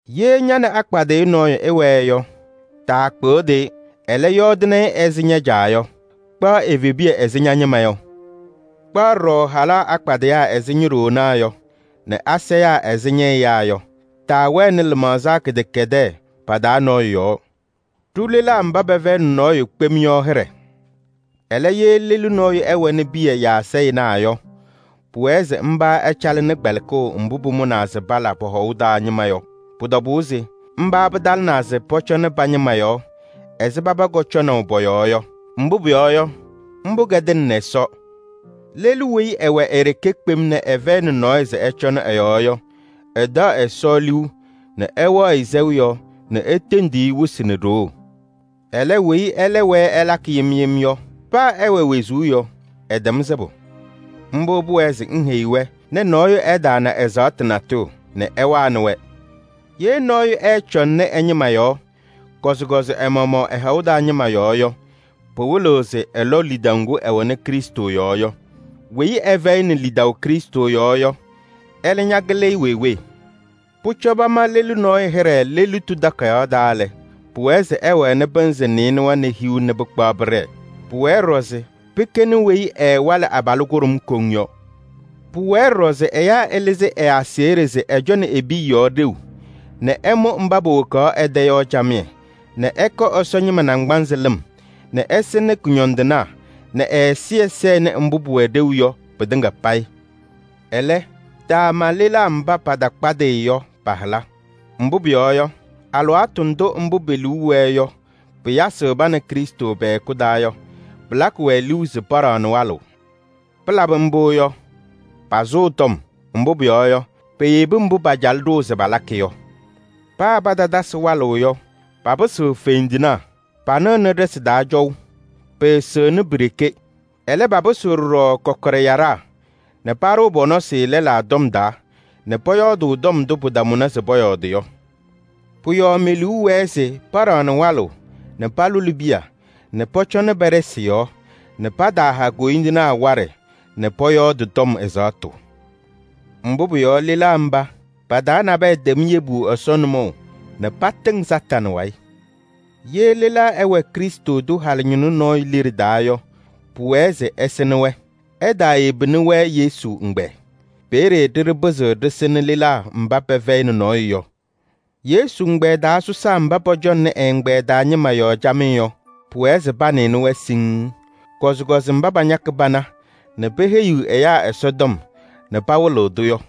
Ye ña nɛ akpadɩyʋ nɔɔyʋ ɩwɛɛ yɔ, taakpɩɣdɩ-ɩ, ɛlɛ, yɔɔdɩnɩ-ɩ ɛzɩ ña-caa yɔ. Kpaɣ evebiya ɛzɩ ña-ñɩma yɔ. Kpaɣ ɖɔɖɔ halaa akpadɩyaa ɛzɩ ño-ɖoonaa yɔ nɛ asayaa ɛzɩ ñɛ-ɛyaa yɔ. Taawɛnɩ lɩmaɣza kɩdɛkɛdɛɛ pa-taa nɔɔyʋ yɔɔ. Ɖʋ lelaa mba pɛfɛyɩnɩ nɔɔyʋ kpem yɔ hɩɖɛ. Ɛlɛ, ye lelu nɔɔyʋ ɛwɛnɩ piya yaa sayɩnaa yɔ, pʋwɛɛ se mba ɛcalɩnɩ kpɛlɩkʋʋ mbʋ pʋmʋnaa se pala pɔ-hɔʋ taa ñɩma yɔ. Pʋ-tɔbʋʋ se mba pɩtalɩnaa se pɔcɔnɩ pa-ñɩma yɔɔ ɛzɩ paba kɔcɔnaʋ pɔ-yɔɔ yɔ. Mbʋ pʋyɔɔ yɔ, mbʋ kɛdɩnɩnɩ Ɛsɔ. Lelu weyi ɛwɛ e-ɖeke kpem nɛ ɛfɛyɩnɩ nɔɔyʋ se ɛcɔnɩ ɛ-yɔɔ yɔ, ɛtaɣ Ɛsɔ liu nɛ ɛwɛɣ-ɩ sɛʋ yɔɔ nɛ etendiɣ-i wɩsɩ nɛ ɖoo. Ɛlɛ, weyi ɛlɛ wɛɛ ɛlakɩ yem yem yɔ, paa ɛwɛ wezuu yɔ, ɛtɛm sɩbʋ. Mbʋ pʋwɛɛ se ŋheyi-wɛ nɛ nɔɔyʋ ɛtaana ɛzaɣtʋ natʋyʋ nɛ ɛwanɩ-wɛ. Ye nɔɔyʋ ɛɛcɔŋnɩ ɛ-ñɩma yɔɔ, kɔzɩkɔzɩ ɛ-maɣmaɣ ɛ-hɔʋ taa ñɩma yɔɔ yɔ, pɩwɩlɩɣ se ɛlɔ lidaʋ ŋgʋ ɛwɛnɩ Krɩstʋ yɔɔ yɔ. Weyi ɛfɛyɩnɩ lidaʋ Krɩstʋ yɔɔ yɔ, ɛlɛ ñakɩlɩ-ɩ wee wee. Pʋcɔ pama lelu nɔɔyʋ hɩɖɛ lelitu takayaɣ taa lɛ, pʋwɛɛ se ɛwɛnɩ pɩnzɩ nɩɩnʋwa nɛ hiu nɛ pɩkpaɣ pɩɖɛɛ. Pʋwɛɛ ɖɔɖɔ se pɩkɛnɩ weyi ɛɛwalɩ abalʋ kʋɖʋm koŋ yɔ. Pʋwɛɛ ɖɔɖɔ se ɛyaa ɛlɩzɩ ɛ-aseɣɖe se ɛcɔnɩ e-piya yɔɔ ɖeu nɛ ɛmʋ mba powokaɣ ɛ-tɛ yɔ camɩyɛ nɛ ɛkɔ Ɛsɔ ñɩma naŋgbanzɩ lɩm nɛ ɛsɩnɩ kʋñɔndɩnaa nɛ ñɛ-ɛzɩyɛ sɛnɩ mbʋ mbʋ pʋwɛ ɖeu yɔ pɩtɩŋa payɩ. Ɛlɛ, taama lelaa mba patakpadɩyɩ yɔ pa-hɩla. Mbʋ pʋyɔɔ yɔ, alɩwaatʋ ndʋ mbʋ pe-liu wɛɛ yɔ pɩyasɩɣ pa nɛ Krɩstʋ pɛ-hɛkʋ taa yɔ, pɩlakɩ-wɛ liu se paɖaɣnɩ walʋʋ. Palabɩ mbʋ yɔ, pasʋʋ tɔm. Mbʋ pʋyɔɔ yɔ, peyebi mbʋ pacalɩ ɖʋʋ se palakɩ yɔ. Paa patatasɩ walʋʋ yɔ, papɩsɩɣ fendinaa, panɩɣnɩ ɖɩsɩ taa cɔʋ. Pɩɩsɩɣnɩ pi-ɖeke. Ɛlɛ, papɩsɩɣ ɖɔɖɔ kɔkɔɖɛ yaɖaa nɛ paɖʋʋ pɔ-nɔsɩ lɛlaa tɔm taa nɛ pɔyɔɔdʋʋ tɔm ndʋ pɩtamʋnɩ se pɔyɔɔdɩ yɔ. Pʋ-yɔɔ me-liu wɛɛ se paɖaɣnɩ walʋʋ nɛ palʋlɩ piya nɛ pɔcɔnɩ pa-ɖɩsɩ yɔɔ nɛ pataaha koyindinaa waɖɛ nɛ pɔyɔɔdɩ tɔm ɛzaɣtʋ. Mbʋ pʋyɔɔ yɔ, lelaa mba, pa-taa nabɛyɛ tɛm yebu Ɛsɔ nʋmɔʋ nɛ patɩŋ Satanɩ wayɩ. Ye lelaa ɛwɛ Krɩstʋ tʋ halʋ ñɩnʋ nɔɔyʋ liɖe taa yɔ, pʋwɛɛ se ɛsɩnɩ-wɛ. Ɛtaayebini-wɛ Yesu ɛgbɛyɛ. Peeye ɖɩɖɩ pɩzɩɣ ɖɩsɩnɩ lelaa mba pɛfɛyɩnɩ nɔɔyʋ yɔ. Yesu ɛgbɛyɛ taa sɔsaa mba pɔcɔŋnɩ ɛ-ɛgbɛyɛ taa ñɩma yɔɔ camɩyɛ yɔ, pʋwɛɛ se panɩnɩ-wɛ siŋŋ. Kɔzɩkɔzɩ mba pañakɩ pana nɛ peheyiɣ ɛyaa Ɛsɔtɔm nɛ pawɩlɩɣ-tʋ yɔ.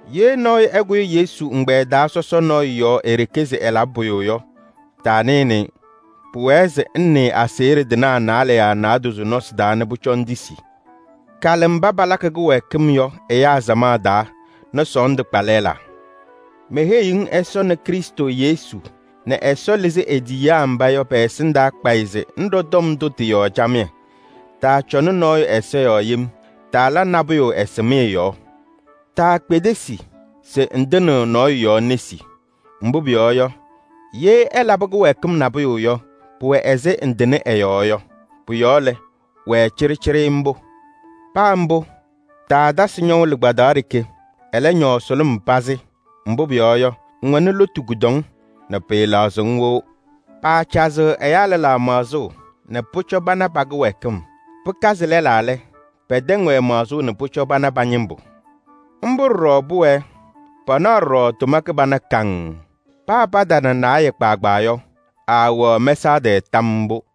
Ye nɔɔyʋ ɛkʋyɩ Yesu ɛgbɛyɛ taa sɔsɔ nɔɔyʋ yɔɔ e-ɖeke se ɛlabɩ pʋyʋ yɔ, taanɩnɩ-ɩ. Pʋwɛɛ se ŋnɩɩ aseɣɖe tɩnaa naalɛ yaa naadozo nɔsɩ taa nɛ pʋcɔ ŋtisi. Kalɩ mba palakɩ kɩwɛɛkɩm yɔ ɛyaa samaɣ taa nɛ sɔɔndʋ kpa lɛlaa. Meheyiɣ-ŋ Ɛsɔ nɛ Krɩstʋ Yesu nɛ Ɛsɔ lɩzɩ e-tiyiyaa mba yɔ pɛ-ɛsɩndaa kpayɩ se ŋɖɔ tɔm ndʋ tɩ-yɔɔ camɩyɛ. Taacɔnɩ nɔɔyʋ ɛza yɔɔ yem, taala nabʋyʋ ɛsɩmɩyɛ yɔɔ. Taakpedesi se ŋtɩnɩɣ nɔɔyʋ yɔɔ nesi. Mbʋ pʋyɔɔ yɔ, ye ɛlabɩ kɩwɛɛkɩm nabʋyʋ yɔ, pʋwɛ ɛzɩ ŋtɩnɩ ɛ-yɔɔ yɔ. Pʋ-yɔɔ lɛ, wɛɛ cɩɖɩcɩɖɩ mbʋ. Paa mbʋ, taatasɩ ñɔʋ lɩkpadaɣ ɖeke, ɛlɛ, ñɔɔ sʋlʋm pazɩ. Mbʋ pʋyɔɔ yɔ, ŋwɛnɩ lotu kʋdɔŋ nɛ pɩɩlaɣzɩɣ-ŋ wɩʋ. Paacazɩɣ ɛyaa lɛlaa maɣzʋʋ nɛ pʋcɔ pana pa-kɩwɛɛkɩm. Pɩkazɩ lɛlaa lɛ, pɛtɛŋ-wɛ maɣzʋʋ nɛ pʋcɔ pana pa-ñɩmbʋ. Mbʋ ɖɔɖɔ pʋwɛɛ, panaɣ ɖɔɖɔ tʋma kɩbana kaŋŋ. Paa patana naayɛ kpaagbaa yɔ, aawɛɣ mɛsaɣ tɛɛ tam mbʋ.